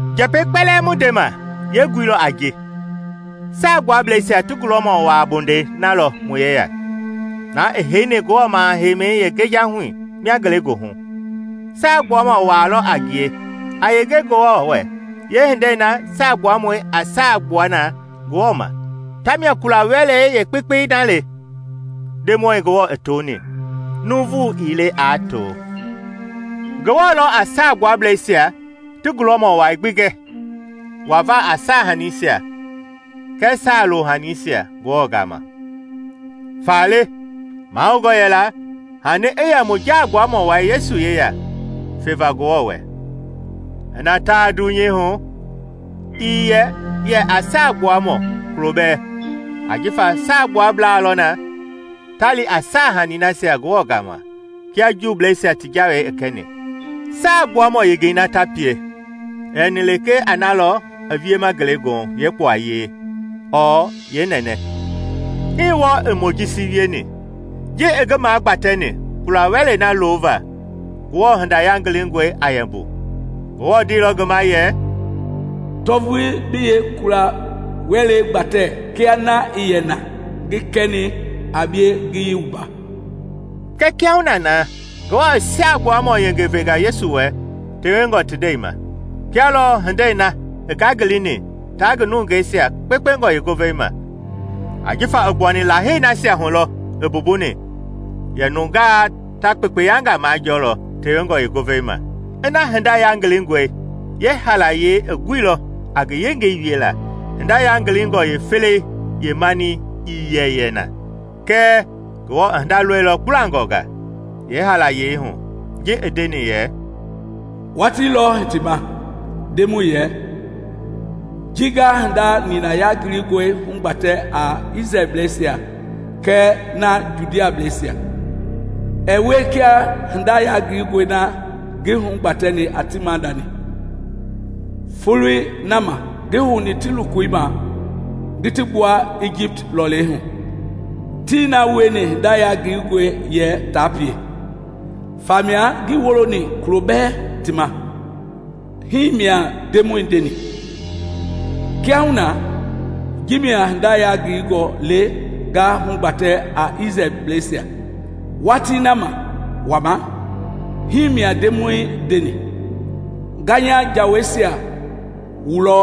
Njɛpɛi kpɛlɛɛ mu ndema yeengui lɔ a ji: Saagbuablɛisia ti gulɔmɔ waa bondɛi na lɔ mu yeya, na i heini Ngewɔ maha-heimɛi yeengejahui mia ngelegoohu. Saagbuamɔ waa lɔ a ngie a yenge Ngewɔ wɛ yeehindei na saagbuamɔi a saa gbua na Ngewɔ ma, tamia kula-wɛlei yeekpekpei na le Ndemɔi Ngewɔ i toni, nuuvu ii le aa to. Ngewɔ lɔ a Saagbuablɛisia ti gulɔmɔ wai gbi gɛ wava a saahaniisia kɛɛ saa-lohaniisia Ngewɔ gama, faale mahoungɔ yɛla hani i yɛ mu Jaagbuamɔ Wai Yesu yeya feva Ngewɔ wɛ. Ina taa dunyei hu, ii yɛ yɛ a Saagbuamɔ kulo bɛɛ, ajifa Saagbuablaa lɔ na ta li a saahani nasia Ngewɔ gaama kia Juubleisia ti Jawei i kɛni. Saagbuamɔ yengei na ta pie i yɛni lekee a na lɔ i wiema ngelegoohu yeekpuayei ɔɔ yeenɛnɛ. Hii wɔɔ i Mojisi wieni. Ji i ngi magbatɛni kula-wɛlei na lova Ngewɔ Hinda Yangilingɔi a yɛ mbu, Ngewɔ ndeilɔ ngi ma yɛ, “Tɔ vulii bi yeekula-wɛlei gbatɛ kia na i yɛ na ngi kɛni a bie ngiyei wumba.” Kɛɛ kiahuna na, Ngewɔ i saagbuamɔ yengei venga Yesu wɛ tewengɔ ti ndɛi ma, kia lɔ hindei na i ngangilini taa ngi nungeisia kpekpengɔ yeengovei ma, ajifa i gbuani Lahei nasia hu lɔɔ i mbumbuni yɛ nungaa ta kpekpeyangaa majɔɔlɔ tewengɔ yeengovei ma. Ina hinda yangilingɔi yeehaalayei i guilɔ a ngi yengei wiela, hinda yangilingɔ yeefelei yeemani ii yɛ yɛ na. Kɛɛ Ngewɔ i hinda lɔilɔ kpulangɔnga yeehaalayei hu ji i ndeni yɛ, “Watii lɔ hitima, Ndemɔi yɛ, ji nga hinda nina yangilingɔi hugbatɛ a Isrɛlbleisia kɛɛ na Judableisia. Ɛɛ wie kia hinda yangilingɔi na ngi hugbatɛni a ti maadani folei na ma ngi houni ti lokoi ma ngi ti gbua Ijipt lɔlei hu. Tii na wieni hinda yangilingɔi yɛ ta pie, famia ngii woloni kulo bɛ ti ma, himia Ndemɔi ndeni. Kiahuna, ji mia hinda yangilingɔi le nga hugbatɛ a Isrɛlbleisia Watii na ma wama, himia Ndemɔi ndeni: Nga nya Jaweisia wulɔ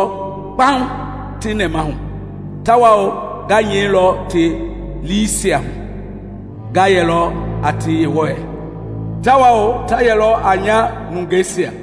kpaŋ ti nɛmahu, tawao nga nyɛilɔ ti liisia hu. Nga yɛlɔ a ti Yewɔi, tawao ta yɛlɔ a nya nungeisia.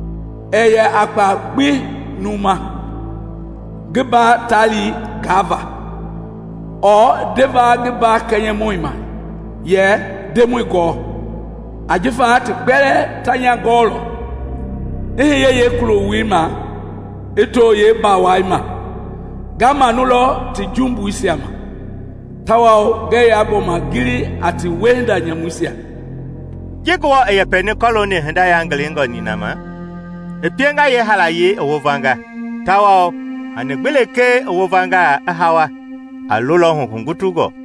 Ɛɛ yɛ a kpaa gbi numu ma. ngi mba taali gaava, ɔɔ ndeva ngi mba kɛnyɛmɔi ma, yɛ ‘Ndemɔi gɔɔ!’ Ajifa ti kpɛlɛɛ ta nya gɔɔlɔ, i hiye yeekuloi ma i too yeembawai ma. Nga manulɔ ti jumbuisia ma, tawao ngɛɛ yaa gbɔma gili a ti wiehinda nyamuisia.” Ji Ngewɔ i yɛpɛni kɔlooni hinda yangilingɔ nina ma, i pienga yeehaalayei i wovanga; tawao hani gbi lekee i wovanga, i hawa, a lolɔhu hugutungɔ.